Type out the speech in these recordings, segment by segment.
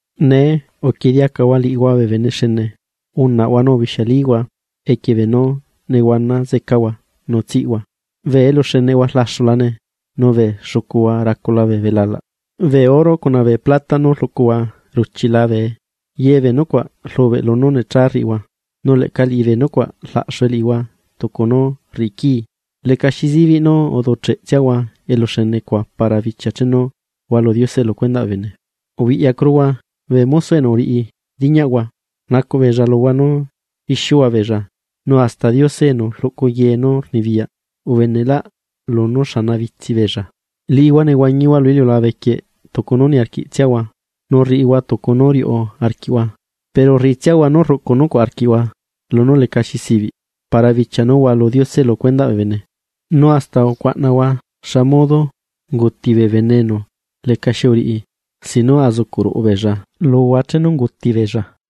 Nee, ¡uquieꞌe diacahua liꞌihua bee bene xene! ¡Unaꞌhua nu ubixialihua equie nú nehuana zecahua nu cuna nú tsiꞌhua! Bee eluxeneꞌhua rlaxulane, nu bee xucuhua racula bee belalaꞌ. Bee oro cuna bee plata nú rluꞌcuhua ruchila bee. Ye bee nucuaꞌ rlubeꞌ lunú necha rriꞌihua, nu leꞌca liꞌibee nucuaꞌ laꞌxue liꞌihua tucu nú rriꞌi quii. Lecaxi zibiꞌ nú uducheꞌ tsiahua eluxene cuaꞌ para bichia chenu hualu Diose lu cuendaꞌ bee bene. Ubiꞌyacuruhua, bee mosoꞌ enu uriꞌi riñaꞌhua, rnacuꞌ beella luhua nú ixiuhua beella, nu hasta Diose enu rluꞌcu ye nú rnibiyaꞌ ubeneꞌlaꞌ lunú xanabitsi beella. Liꞌihua nehuañihua lu iliulabe quieꞌ tucu nú niarquiꞌtsiahua nu rriꞌihua tucu nú riuꞌ arquiꞌhua, pero rriꞌitsiahua nú rruꞌcu nucuaꞌ arquiꞌhua lunú lecaxi zibiꞌ para bichia nú hualu Diose lu cuendaꞌ bee bene. Nu hasta ucuaꞌnahua xa modo unguti bee bene enu lecaxi uriꞌi sin nú azucuꞌ ruꞌu beella luhua chenu unguti beella.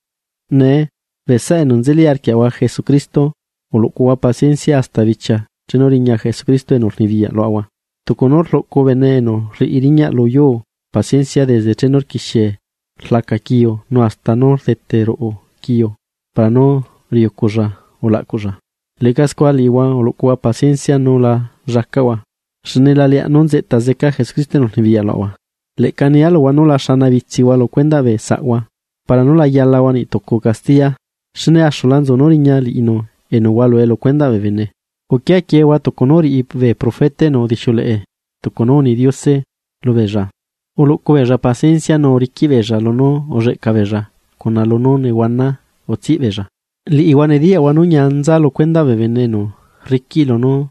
Nee, bee saꞌa enu nzeli arquiaꞌahua Jesucristo, uluꞌcuhua paciencia hasta bichia chenu riña Jesucristo enu rnibiyaꞌ luaꞌahua. Tucu nú rluꞌcu bene enu rriꞌi riñaꞌ lu yuu paciencia desde chenu rquixie rlaca quiu nu hasta nú rdete ruꞌu quiu para nú riuculla ulaꞌcuꞌlla. Leꞌca scua liꞌihua uluꞌcuhua paciencia nu la llacaꞌhua, xne la leaꞌ nú nzeꞌta zeca Jesucristo enu rnibiyaꞌ luaꞌahua. Leꞌca nia luhua nú la xana bitsiaꞌhua lu cuendaꞌ bee saꞌhua para nú la yalahua niꞌ tucu castiya, xne axula nzu nú riña liꞌinu enu hualue lu cuendaꞌ bee bene. Uquia quiehua tucu nú uriꞌi bee profeta enu udixiuleꞌe tucu nú uni Diose lubeella, uluꞌcu beella paciencia nu uriquiꞌ beella lunú nehuana ulleꞌca beella. Liꞌihua nediyaꞌhua nú ñia nza lu cuendaꞌ bee bene enu rriquiꞌ lunú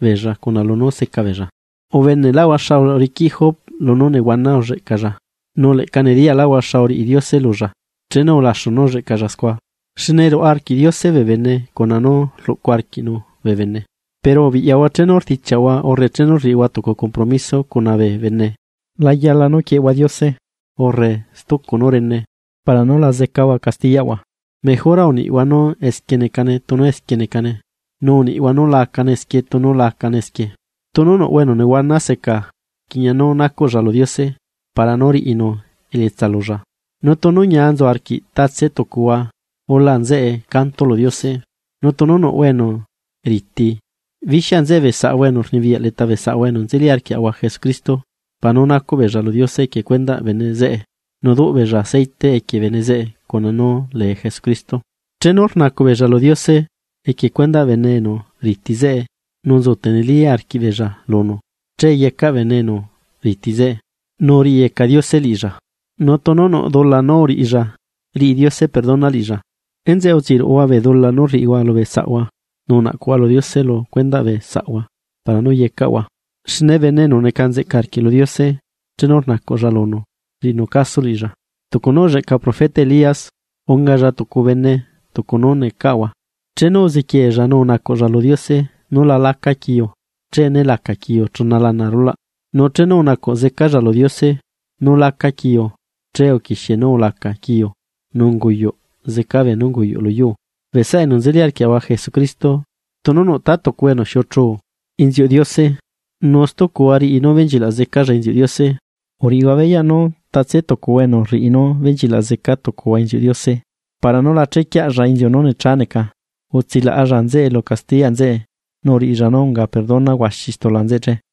nehuana seca. Ubeneꞌlaꞌhua xa uriquiꞌ Job lunú nehuana ulleꞌcalla, nu leꞌca nediyaꞌhua xa uriꞌi Diose lulla chenu ulaxu nú ulleꞌcalla scua, xne ruaꞌa arquiꞌ Diose bee bene cuna nú rluꞌcu arquiꞌnu bee bene. Pero ubiꞌyahua chenu rdichiaꞌhua urre chenu rriꞌihua tucu compromiso cuna bee bene, la yala nú quieꞌehua Diose, urre stucu nú rene para nú la zecahua castiyaꞌhua, mejora uniꞌhua nú esquie necane tunu esquie necane, nu uniꞌhua nú la acane esquie tunu lacane esquie. Tunu nuꞌhua enu nehuana seca, rquiꞌña nú nacuꞌlla lu Diose para nú riꞌinu elietsa lulla. Nu tunu ñia nzu arquiꞌ tatse tucuhua ula nzeꞌe canto lu Diose. Nu tunu nuꞌhua enu riti, bixia nzeꞌe bee saꞌahua enu rnibiyaꞌ leta bee saꞌahua enu nzeli arquiaꞌahua Jesucristo, para nú nacuꞌ beella lu Diose equie cuendaꞌ bene zeꞌe nu duꞌ beella aceite equie bene zeꞌe lunú lee Jesucristo. Chenu rnacuꞌ beella lu Diose equie cuendaꞌ bene enu riti zeꞌe nu nzu teneli arquiꞌbeella lunu, che yecaꞌ bene enu riti zeꞌe, nu riꞌiyeca Diose liꞌilla, nu tunu nuꞌ dula nú uriꞌilla riꞌi Diose perdona liꞌilla. Enzeꞌe utsiruꞌuhua bee dula nú uriꞌihua lubee saꞌhua, nu unaꞌcuꞌhua lu Diose lu cuendaꞌ bee saꞌhua para nú yecaꞌhua. Xne bene enu neca nzeꞌca arquiꞌ lu Diose chenu rnacuꞌlla lunu, rriꞌinu caso liꞌilla. Tucu nú ulleꞌca profeta Elías ungalla tucu bene tucu nú necaꞌahua, chenu uziquiella nu unacuꞌlla lu Diose nú la laca quiu, che né laca quiu chuna lana arulaꞌ. Nu chenu unacuꞌ zecalla lu Diose nú laca quiu, che uquixie nú ulaca quiu nu unguyuꞌ zeca beenú unguyuꞌ luyuu. Bee saꞌa enu nzeli arquiaꞌahua Jesucristo, tunu nuꞌ ta tucuhua enu xiuꞌuchu inziuꞌ Diose, nu stucuhua riꞌi nú benchilaꞌ zecalla inziuꞌ Diose. Uriꞌihua beyaꞌ nú tatse tucuhua enu rriꞌi nú benchilaꞌ zeca tucuhua inziuꞌ Diose para nú la chequiaꞌlla inziu nú necha neca, utsilaꞌalla nzeꞌe lu castiyaꞌ nzeꞌe nu uriꞌilla nú unga perdona huaxi stula nzeꞌe che.